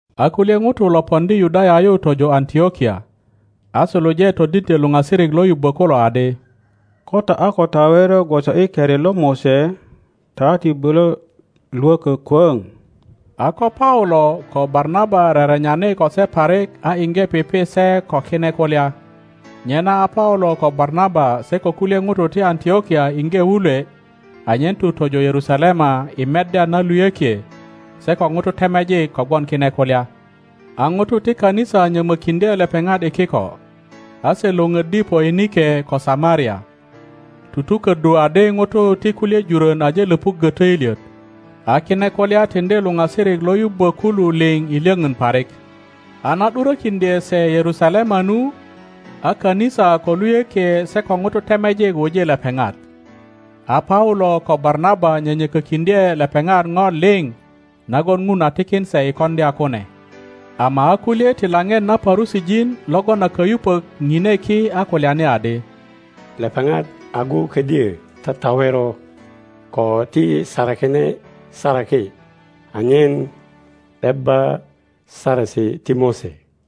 A kulye ŋutu lo poŋdi Yudaya yu tojo Antlokia, a suluje todindyö luŋasirik lo yubbo kulo adi, Ko ta a ko tawero gwoso i keri lo Mose ta ti bulö lwökö kwöŋ. A ko Paulo ko Barnaba rerenyani ko se parik a iŋge pipi se ko kine kulya, nyena a Paulo ko Barnaba se ko kulye ŋutu ti Antlokia iŋge wulwe anyen tu tojo Yerusalema i meddya na luyökie se ko ŋutu temejik kogwon kine kulya. A ŋutu ti kanisa nyömökindye lepeŋat i kiko, a se lwöpöddi Poinike ko Samaria, tutuköddu adi ŋutu ti kulye jurön aje löpuggö töilyet, a kine kulya tiŋdi luŋasirik lo yubbö kulu liŋ i lyöpön parik. A na ’durökiŋdye se Yerusalema nu, a kanisa ko luyökie se ko ŋutu temejik wuji lepeŋat. A Paulo ko Barnaba nyönyökökiŋdye lepeŋat po liŋ nagon Ŋun a tikin se i koŋdya kune. Ama a kulye ti lapet na Parusijin logon a kayupök pine ki a kulyani adi, Lepeŋat agu ködyö tatawero ko ti sarakine saraki anyen ’debba Saresi ti Mose.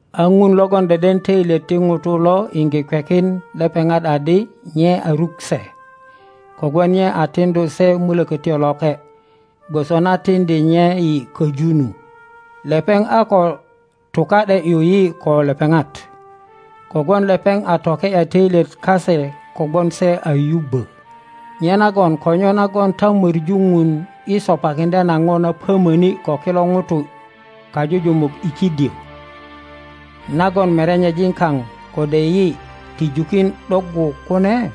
A Ŋun logon deden töilyet ti ŋutu lo iŋge kwekin lepeŋat adi nye a ruk se, kogwon nye a tiŋdu se Mulökötyo Loke, gwoso na tiŋdi nye yi köju nu. Lepeŋ a ko tuka ’de ’yu yi ko lepeŋat, kogwon lepeŋ a toke ’ya töilyet kase kogwon se a yubbö. Nyenagon ko nyo nagon ta möŋu Ŋun i sopakiŋdya na po na pöiyiöni ko kilo ŋutu kajujumuk i kidyö, nagon merenyejin kaŋ kode yi ti jukin ’doggu kune?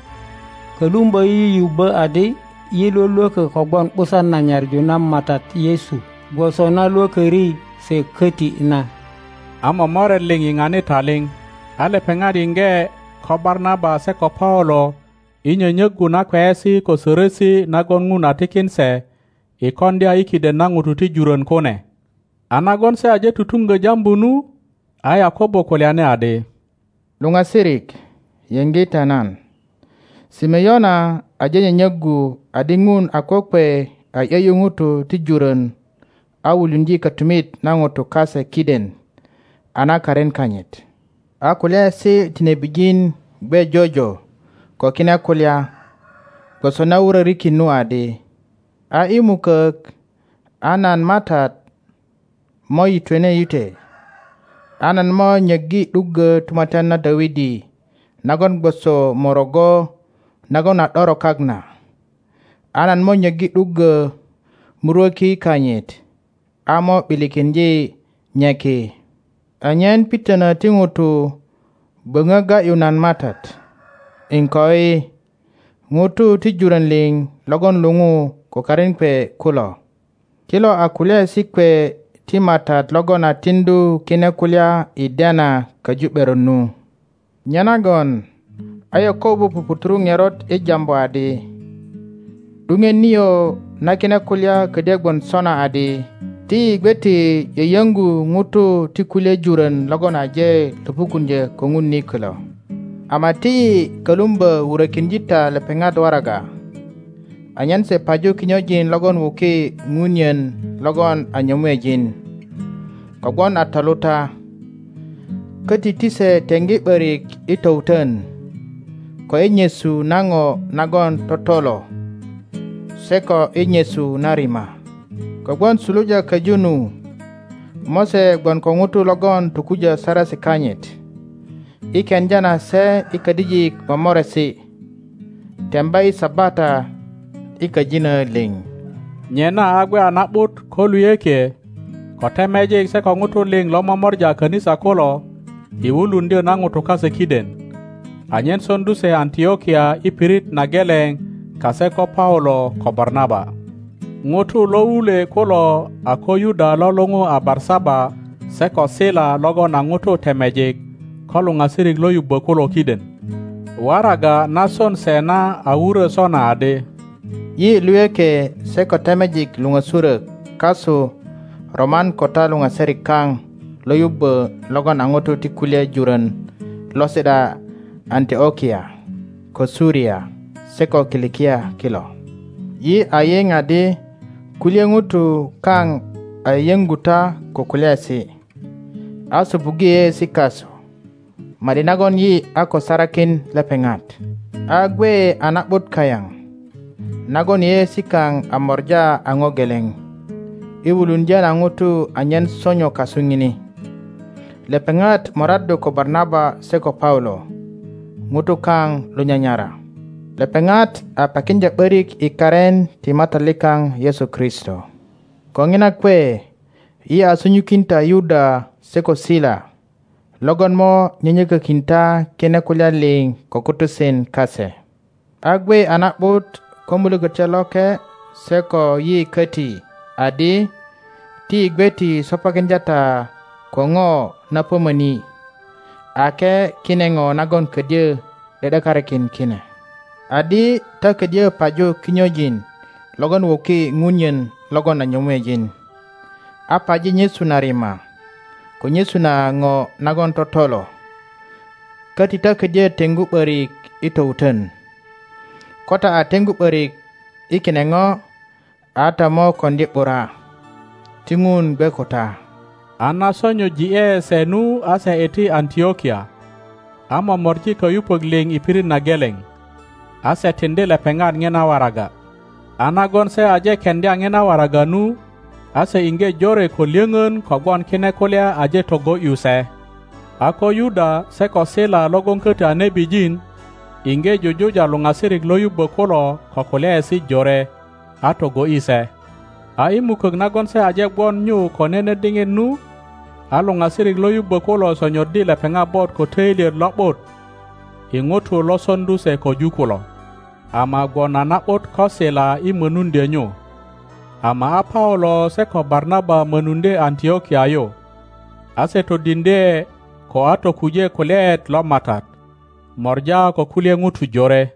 Kölumbö yi yubbö adi yi lwölwökö kogwon ’busan na nyaŋu na Matat Yesu gwoso na lwököri se köti na. A momoret liŋ yiŋani taliŋ; a lepeŋat yiŋge ko Barnaba se ko Paulo i nyönyöggu na kweyesi ko sörösi nagon Ŋun a tikin se i koŋdya i kidenna ŋutu ti jurön kune. A nagon se aje tutuŋgö jambu nu, a Yakobo kulyani adi, Luŋasirik, yiŋge ta nan. Simeona aje nyönyöggu adi Ŋun a kokwe a ’yö ’yu ŋutu ti jurön a wuluŋdye kötumit na ŋutu kase kiden a na karin kanyit. A kulyaesi ti nebijin gwe jojo ko kine kulya, gwoso na wurörikin nu adi, A i mukök, a nan Matat mo yitwene yitwe, nan mo nyöggi ’duggö tumatyan na Dawidi nagon gwoso morogo nagon a ’doro kak na; a nan mo nyöggi ’duggö murwöki kanyit, a mo ’bilikiŋdye nye ki, anyen pitönö ti ŋutu böŋö ga ’yu nan Matat, iŋkoi ŋutu ti jurön liŋ logon luŋu ko karin kwe kulo. Kilo a kulyaesi kwe ti Matat logon a tiŋdu kine kulya i dena köju ’beron nu. Nyenagon a Yakobo puputuru ŋerot i jambu adi, ’Duŋet nio na kine kulya ködyö gwon sona adi, ti yi gwe ti yöyöŋgu ŋutu ti kulye jurön logon aje löpukuŋdyö ko Ŋun ni kilo, ama ti yi kölumbö wurökiŋdye ta lepeŋat waraga, anyen se paju kinyojin logon wuki punyen logon a nyömuejin, kogwon a toluta; köti ti se teŋgi ’börik i towutön, ko i nyesu na ŋo nagon totolo, se ko i nyesu na rima. Kogwon suluja köju nu, Mose gwon ko ŋutu logon tokujö Saresi kanyit, i keŋdya na se i kadijik momoresi temba i Sabata i köjinö liŋ. Nyenaa gwe a na ’but ko luyökie, ko temejik se ko ŋutu liŋ lo momora a kanisa kulo i wuluŋdyö na ŋutu kase kiden, anyen soŋdu se Antlokia i pirit na geleŋ kase ko Paulo ko Barnaba. Ŋutu lo wulwe kulo a ko Yuda lo luŋu a Barsaba se ko Sila logon a ŋutu temejik ko luŋasirik lo yubbö kulo kiden. Waraga na son se na a wurö sona adi, Yi luyökie se ko temejik luŋösurök kasu roman ko ta luŋasirik kaŋ lo yubbö logon a ŋutu ti kulye jurön lo si ’da Antlokia, ko Suria se ko Kilikia kilo. yi a yiŋ adi kulye Ŋutu kaŋ a yöyoŋgu ta ko kulyaesi, a sopuggo yeyeesi kasu, ma ’di nagon yi a ko sarakin lepeŋat. a gwe a na ’but kayaŋ, nagon yeyeesi kaŋ a mora aŋo geleŋ, i wuluŋdyö na ŋutu anyen sonyo kasu ŋini. Lepeŋat moraddu ko Barnaba se ko Paulo ŋutu kaŋ lo nyanyara. Lepeŋat a pakiŋdya ’böriki karin ti Matat likaŋ Yesu Kristo. Ko ŋina kwe yi a sunyukin ta Yuda se ko Sila logon mo nyönyökökin ta kine kulya liŋ ko kutusen kase. a gwe a na ’but ko Mulökötyo Loke se koyi köti adi ti yi gwe ti sopakiŋdya ta ko ŋo na pömöni, ake kine ŋo nagon ködyö ’de ’dekarikin kine; adi ta ködyö paju kinyojin logon wuki ŋunyen logon a nyömuejin, a paji nyesu na rima, ko nyesu na ŋo nagon totolo, köti ta ködyö teŋgu ’börik i towutön. Ko ta a teŋgu ’börik i kine ŋo, a ta mo koŋdi ’bura. Ti Ŋun gwe ko ta. A na sonyoji ’e se nu a se iti Antlokia, a momori kayupök liŋ i pirit na geleŋ, a se tiŋdi lepeŋat ŋina waraga. A nagon se aje keŋdya ŋina waraga nu, a se iŋge jore ko lyöŋön kogwon kine kulya aje togo ’yu se. A ko Yuda se ko Sila logon köti a nebijin, iŋge jujuja luoasirik lo yubbö kulo ko kulyaesi jore, a togo ’yi se. A i mukök nagon se aje gwon nyu ko nene diŋit nu, a luoasirik lo yubbö kulo sonyoddi lepeŋat bot ko töilyet lo ’but i ŋutu lo soŋdu se köju kulo. [ Ama gwon a na ’but ko Sila i mönuŋdyö nyu.] Ama a Paulo se ko Barnaba mönuŋdye Antlokia yu, a se todiŋdye ko a tokuje kulyaet lo Matat, mora ko kulye ŋutu jore.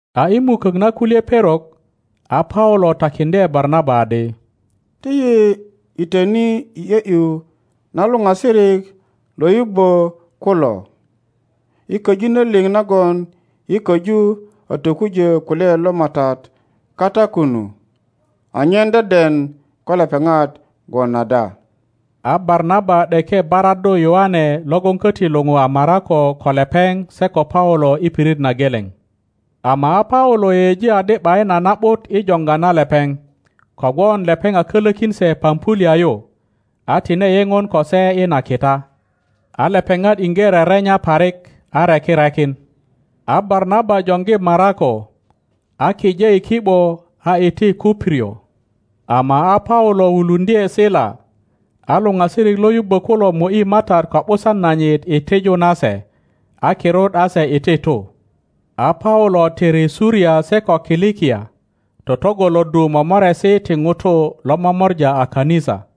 A i mukök na kulye perok, a Paulo takiŋdye Barnaba adi, Ti yi yitöni i ’yö ’yu na luŋasirik lo yubbö kulo i köjinö liŋ nagon yi köju a tokujö kulyaet lo Matat kata kunu, anyen deden ko lepeŋat gwon ada. A Barnaba ’deke baraddu Yoane logon köti luou a Marako ko lepeŋ se ko Paulo i pirit na geleŋ. Ama a Paulo yeyeji adi ’bayin a na ’but i joŋga na lepeŋ, kogwon lepeŋ a kölökin se Pampulia yu, a tine yeŋon ko se i na kita. A lepeŋat iŋge rerenya parik, a reki rekin. A Barnaba joŋgi Marako, a kije i ki ’bo a iti Kuprio; ama a Paulo wuluŋdye Sila, a luŋasirik lo yubbö kulo mo ’yi Matat ko ’busan nanyit i tiju na se, a kirut a se iti tu. A Paulo tiri Suria se ko Kilikia, totŋgoloddu momoresi ti ŋutu lo momora a kanisa.